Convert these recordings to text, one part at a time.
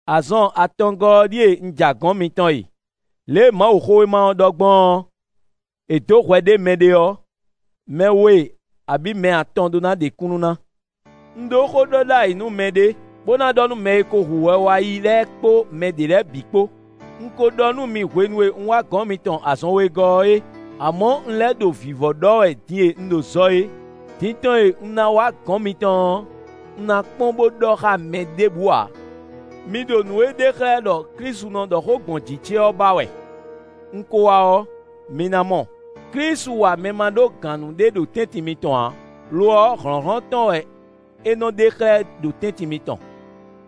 Azɔn atɔngɔ́ ɔ́ ɖíe un ja gɔ̌n mitɔn e. Lě e Mawuxówéma ɔ́ ɖɔ gbɔn ɔ́, “È dǒ hwɛ ɖé mɛɖé ɔ́, mɛ we, abǐ mɛ atɔn ɖó ná ɖe kúnnu ná.” Un ɖó xóɖɔɖ'ayǐnúmɛ ɖé, bó ná ɖɔ nú mɛ e ko hu hwɛ wá yi lɛ́ɛ kpó mɛ ɖě lɛ́ɛ bǐ kpó; un ko ɖɔ nú mi hwenu e un wá gɔ̌n mitɔn azɔn wegɔ́ ɔ́ é; amɔ̌ un lɛ́ ɖo vǐvɔ́ ɖɔ wɛ din e un ɖo zɔ é. Din tɔn e un ná wá gɔ̌n mitɔn ɔ́, un ná kpɔ́n bó ɖɔ xá mɛ ɖěbǔ ǎ. Mi ɖo nǔ e ɖe xlɛ́ ɖɔ Klísu nɔ ɖɔ xó gbɔn jǐ ce ɔ́ ba wɛ; un ko wá ɔ́, mi ná mɔ. Klísu wa mɛ ma ɖó gǎn nú ɖé ɖo tɛ́ntin mitɔn ǎ; lo ɔ́, hlɔ̌nhlɔ́n tɔn wɛ é nɔ ɖe xlɛ́ ɖo tɛ́ntin mitɔn.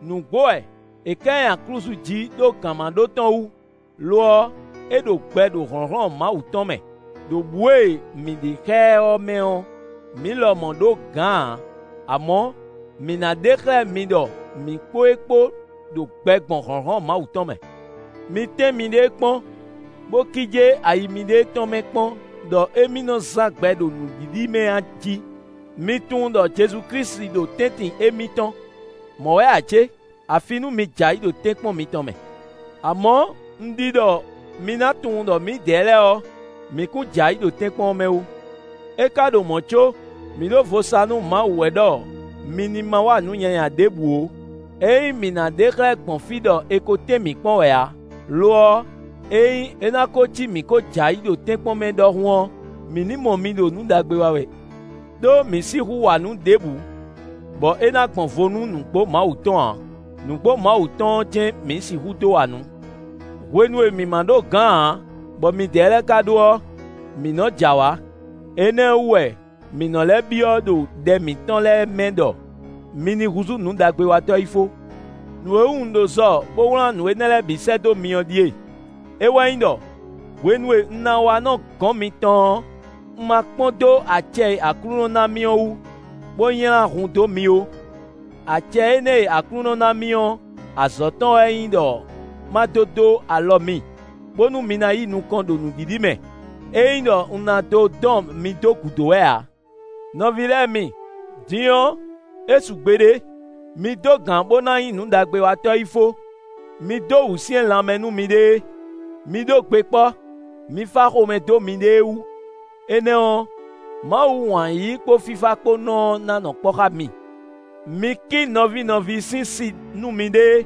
Nǔgbó wɛ; è ká ɛ nyi aklúzu jí ɖó gǎnmaɖó tɔn wú; lo ɔ́, é ɖo gbɛ ɖo hlɔ̌nhlɔ́n Mawu tɔn mɛ. Đo bǔ e mǐ ɖe xá ɛ ɔ́ mɛ ɔ́, mǐ lɔmɔ̌ ɖó gǎn ǎ; amɔ̌, mǐ ná ɖe xlɛ́ mi ɖɔ mǐ kpó e kpó ɖo gbɛ gbɔn hlɔ̌nhlɔ́n Mawu tɔn mɛ. Mi tɛ́n miɖée kpɔ́n, bó kíjé ayi miɖée tɔn mɛ kpɔ́n ɖɔ émí nɔ́ zán gbɛ ɖo nǔɖiɖi mɛ a jí? Mi tunwun ɖɔ Jezu Klísu ɖo tɛ́ntin émí tɔn; mɔ̌ wɛ ǎ cé? Afi nú mi jɛ ayǐ ɖo tɛ́nkpɔ́n mitɔn mɛ. Amɔ̌, un ɖi ɖɔ mi ná tunwun ɖɔ mǐdɛɛ lɛ́ɛ ɔ́, mǐ kún jɛ ayǐ ɖo tɛ́nkpɔ́n mɛ ó. É ka ɖo mɔ̌ có, mǐ ɖo vo sa nú Mawu wɛ ɖɔ mi ní ma wa nǔ nyanya ɖěbǔ ó; é nyí mǐ ná ɖe xlɛ́ gbɔn fí ɖɔ è ko tɛ́n mǐ kpɔ́n wɛ ǎ; lo ɔ́, ényí é ná bo cí mǐ ko jɛ ayǐ ɖo tɛ́nkpɔ́n mɛ ɖɔhun ɔ́, mǐ ní mɔ mi ɖo nǔ ɖagbe wa wɛ. Đó mǐ sixú wa nǔ ɖěbǔ, bɔ é ná gbɔn vo nú nǔgbó Mawu tɔn ǎ; nǔgbó Mawu tɔn ɔ́ jɛ́n mǐ sixú dó wa nǔ. Hwenu e mǐ ma ɖó gǎn ǎ, bɔ midɛɛ lɛ́ɛ ka ɖó ɔ́, mǐ nɔ jɛ awǎ; énɛ́ wú wɛ, mǐ nɔ́ lɛ́ byɔ́ ɖo ɖɛ mǐtɔn lɛ́ɛ mɛ ɖɔ mi ní húzú nǔɖagbewatɔ́ yi fó. Nǔ e wú un ɖo zɔ bó wlán nǔ énɛ́ lɛ́ɛ bǐ sɛ́ dó mi ɔ́ ɖíe: é wɛ nyí ɖɔ, hwenu e un ná wá nɔ gɔ̌n mitɔn ɔ́, un ma kpɔ́n dó acɛ e Aklúnɔ ná mì ɔ́ wú, bó nylá hun dó mi ó; acɛ énɛ́ e Aklúnɔ ná mì ɔ́, azɔ̌ tɔn wɛ nyí ɖɔ ma dó dó alɔ mi, bónú mi ná yi nukɔn ɖo nǔɖiɖi mɛ; é nyí ɖɔ un ná dó dɔn mi dó gǔdo wɛ ǎ. Nɔví lɛ́ɛ mi, din ɔ́, é su gbeɖé! Mi dó gǎn bó ná nyí nǔɖagbewatɔ́ yí fó; mi dó wǔsyɛ́n lanmɛ nú miɖée; mi ɖó gbe kpɔ́; mi fá xomɛ dó miɖée wú; énɛ́ ɔ́, Mawu wǎn yíyí kpó fífá kpó nɔ ɔ́ ná nɔ kpɔ́ xá mi. Mi kí nɔví nɔví sín si nú miɖée,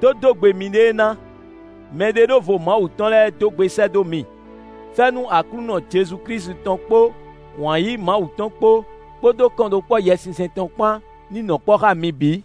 dó dó gbe miɖée ná. Mɛɖeɖóvo Mawu tɔn lɛ́ɛ dó gbe sɛ́ dó mi. Fɛ́nú Aklúnɔ Jezu Klísu tɔn kpó wǎn yíyí Mawu tɔn kpó, kpódó kɔnɖókpɔ́ Yɛsinsɛn tɔn kpán ní nɔ kpɔ́ xá mi bǐ.